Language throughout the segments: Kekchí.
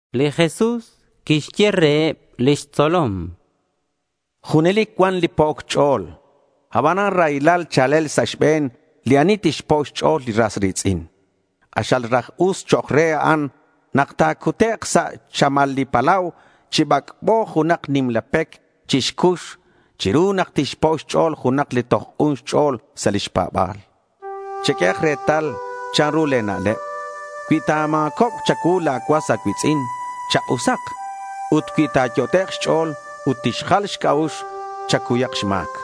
Li Jesús quixye reheb lix tzolom: —Junelic cuan li po'oc ch'o̱l. Abanan raylal cha̱lel sa' xbe̱n li ani tixpo' xch'o̱l li ras ri̱tz'in. K'axal raj us chok' re a'an nak ta̱cutek' sa' xchamal li palau chi bac'bo junak nimla pec chi xcux chiru nak tixpo' xch'o̱l junak li toj k'un xch'o̱l sa' lix pa̱ba̱l. Cheq'uehak retal chanru le̱ na'leb. Cui ta̱ma̱cobk cha̱cuu la̱ cuas a̱cui̱tz'in, chak'usak. Ut cui ta̱yot'ek' xch'o̱l ut tixjal xc'a'ux, chacuyak xma̱c.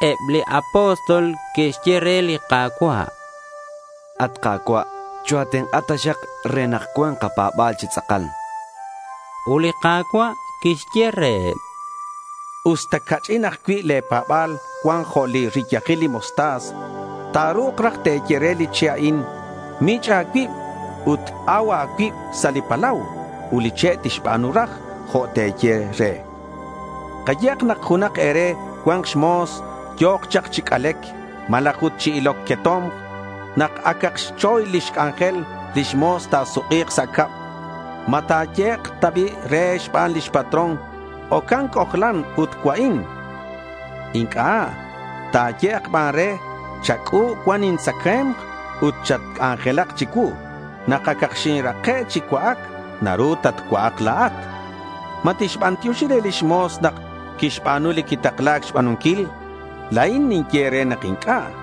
Eb li apóstol que'xye re li Ka̱cua': —At Ka̱cua', choa̱tenk'a taxak re nak cua̱nk kapa̱ba̱l chi tz'akal, chanqueb. Ut li Ka̱cua' quixye reheb: —Usta ca'ch'in ajcui' le̱ pa̱ba̱l cuan jo' li riyajil li mostaza, ta̱ru̱k raj te̱ye re li che' a'in, “Mich' a̱cuib ut au a̱cuib sa' li palau” ut li che' tixba̱nu raj jo' te̱ye re, chan. Kayehak nak junak e̱re cuan xmo̱s yo̱k chak chi c'alec malaj ut chi iloc queto̱mk. Nak acak xchoy lix c'anjel lix mo̱s, ta̱suk'i̱k sa' cab. ¿Ma ta̱yehek' ta bi' re xban lix patrón, “Ocan, c'ojlan ut cua'in”? Inc'a'. Ta̱yehek' ban re: “Chac'u̱b cuan intzacae̱mk ut chatc'anjelak chicuu. Nak acak xinrake' chi cua'ac, naru tatcua'ak la̱at.” ¿Ma tixbantioxi re lix mo̱s nak quixba̱nu li quitakla̱c xba̱nunquil? La̱in ninye nak inc'a'.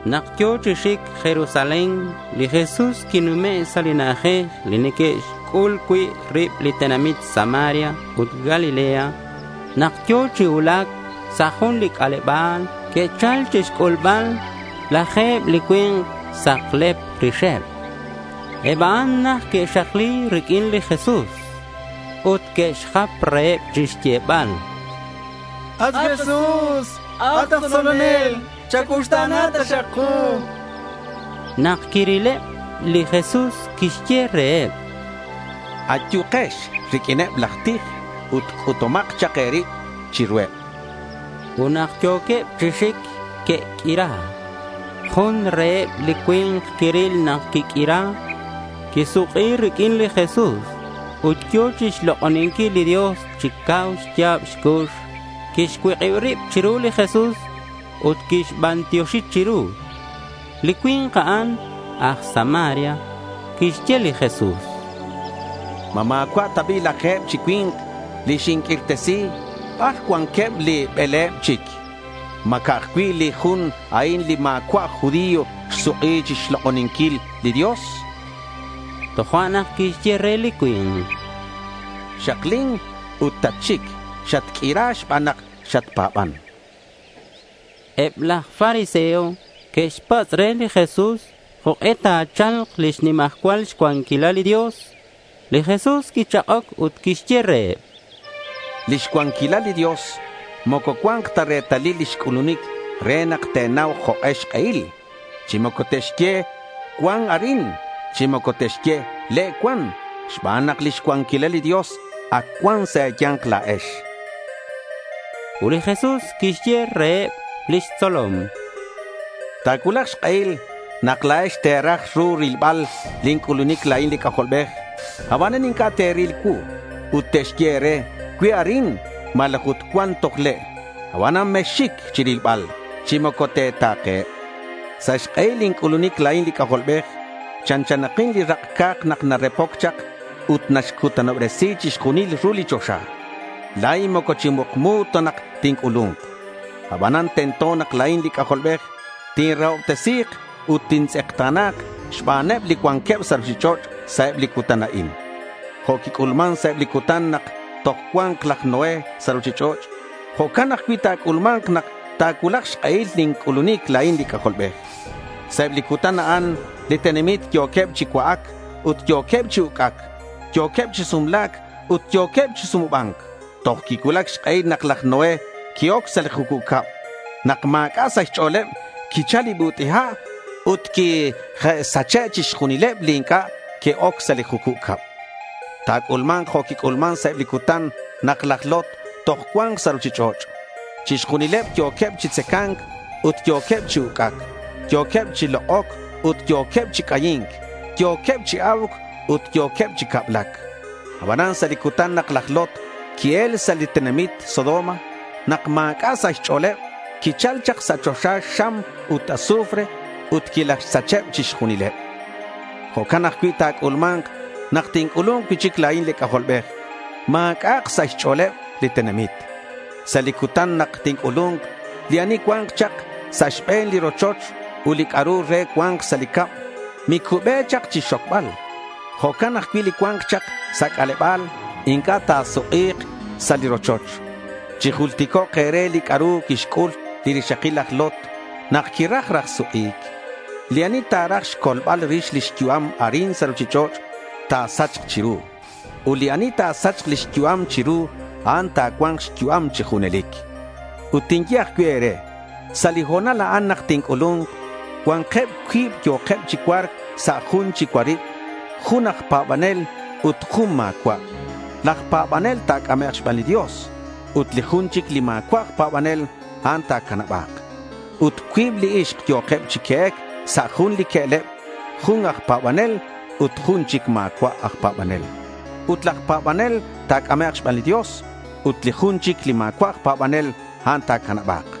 Nak yo̱ chi xic Jerusalén, li Jesús quinume' sa' li na'ajej li neque'xc'ul cui' rib li tenamit Samaria ut Galilea. Nak yo̱ chi cuulac sa' jun li c'aleba̱l, que'chal chixc'ulbal laje̱b li cui̱nk saklep rixeb. Eb a'an najt que'xakli riq'uin li Jesús. Ut que'xjap reheb chixyebal: —At Jesús, at aj tzolonel, chacuuxta̱na taxak ku, chanqueb. Nak quirilebli Jesús quixye reheb: —Ayukex riq'uineb laj tij ut c'utumak chak e̱rib chiruheb, chan reheb. Ut nak yo̱queb chi xic, que'q'uira. Jun reheb li cui̱nk quiril nak quiq'uira, quisuk'i riq'uin li Jesús ut yo̱ chixlok'oninquil li Dios chi cau xya̱b xcux. Quixcuik'ib rib chiru li Jesús ut quixbantioxi chiru. Li cui̱nk a'an aj Samaria. Quixye li Jesús: —¿Ma ma̱cua' ta bi' laje̱b chi cui̱nk li xinq'uirtesi? ¿Bar cuanqueb li bele̱b chic? ¿Ma ca'aj cui' li jun a'in li ma̱cua' aj judío xsuk'i chixlok'oninquil li Dios? chan. Tojo'nak quixye re li cui̱nk: —Xaklin ut tatxic. Xatq'uira xban nak xatpa̱ban, chan. Eb laj fariseo que'xpatz' re li Jesús jok'e ta̱cha̱lk lix nimajcual cuanquilal li Dios. Li Jesús quichak'oc ut quixye reheb: —Lix cuanquilal li Dios moco cua̱nk ta retalil lix c'ulunic re nak te̱nau jok'e xk'ehil. Chi moco te'xye, “cuan arin” chi moco te'xye, “le' cuan”, xban nak lix cuanquilal li Dios ac cuan sa' e̱ya̱nk la̱ex, chan. Ut li Jesús quixye reheb lix tzolom: —Ta̱cuulak xk'ehil nak la̱ex te̱ra ru rilbal lin c'ulunic la̱in li C'ajolbej, abanan inc'a' te̱ril cuu. Ut te'xye e̱re, “cue' arin” malaj ut “cuan toj le'”. Abanan mexxic chirilbal chi moco te̱ta̱keheb. Sa' xk'ehil lin c'ulunic la̱in li C'ajolbej chanchanakin li rak' ca̱k nak narepoc chak ut naxcutanobresi chixjunil ru li choxa. La̱in moco chi mukmu ta tinc'ulu̱nk. Abanan tento nak la̱in li C'ajolbej tinrahobtesi̱k ut tintz'ekta̱na̱k xbaneb li cuanqueb sa' ruchich'och' sa' eb li cutan a'in. Jo' quic'ulman sa' eb li cutan nak toj cua̱nk laj Noé sa' ruchich'och', jo'can ajcui' ta̱c'ulma̱nk nak ta̱cuulak xk'ehil lin c'ulunic la̱in li C'ajolbej. Sa' eb li cutan a'an li tenamit yo̱queb chi cua'ac ut yo̱queb chi uc'ac. Yo̱queb chi sumla̱c ut yo̱queb chi sumuba̱nc toj quicuulac xk'ehil nak laj Noé qui-oc sa' li jucub cab. Nak ma̱c'a' sa' xch'o̱leb quichal li but'i ha' ut quilajxsacheb chixjunileb li inc'a' que'oc sa' li jucub cab. Ta̱c'ulma̱nk jo' quic'ulman sa' eb li cutan nak laj Lot toj cua̱nk sa' ruchich'och'. Chixjunileb yo̱queb chi tzaca̱nc ut yo̱queb chi uc'ac. Yo̱queb chi lok'oc ut yo̱queb chi c'ayi̱nc. Yo̱queb chi a̱uc ut yo̱queb chi cablac. Abanan sa' li cutan nak laj Lot qui-el sa' li tenamit Sodoma, nak ma̱c'a' sa' xch'o̱leb, quichal chak sa' choxa xam ut azufre ut quilajxsacheb chixjunileb. Jo'can ajcui' ta̱c'ulma̱nk nak tinc'ulu̱nk cui'chic la̱in li C'ajolbej. Ma̱c'a'ak sa' xch'o̱leb li tenamit. Sa' li cutan nak tinc'ulu̱nk, li ani cua̱nk chak sa' xbe̱n li rochoch ut li c'a'ru re cua̱nk sa' li cab, micube chak chixxocbal. Jo'can ajcui' li cua̱nk chak sa' c'aleba̱l, inc'a' ta̱suk'i̱k sa' li rochoch. Chijulticok' e̱re li c'a'ru quixc'ul li rixakil laj Lot nak quiraj raj suk'i̱c. Li ani ta̱raj xcolbal rix lix yu'am arin sa' ruchich'och', ta̱sachk chiru. Ut li ani ta̱sachk lix yu'am chiru, a'an ta̱cua̱nk xyu'am chi junelic. Ut tinye ajcui' e̱re: Sa' li ho̱nal a'an nak tinc'ulu̱nk, cua̱nkeb cuib yo̱keb chi cua̱rc sa' jun chi cuarib. Jun aj pa̱banel ut jun ma̱cua'. Laj pa̱banel ta̱c'amek' xban li Dios ut li jun chic li ma̱cua' aj pa̱banel, a'an ta̱canaba̱k. Ut cuib li ixk yo̱keb chi que'ec sa' jun li que'leb, jun aj pa̱banel ut li jun chic ma̱cua' aj pa̱banel. Ut laj pa̱banel ta̱c'amek' xban li Dios ut li jun chic li ma̱cua' aj pa̱banel, a'an ta̱canaba̱k.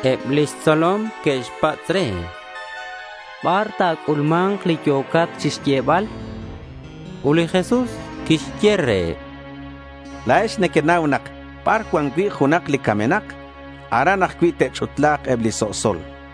Eb lix tzolom que'xpatz' re: —¿Bar ta̱c'ulma̱nk li yo̱cat chixyebal? chanqueb. Ut li Jesús quixye reheb: —La̱ex nequenau nak bar cuan cui' junak li camenak, aran ajcui' te'ch'utla̱k eb li so'sol, chan.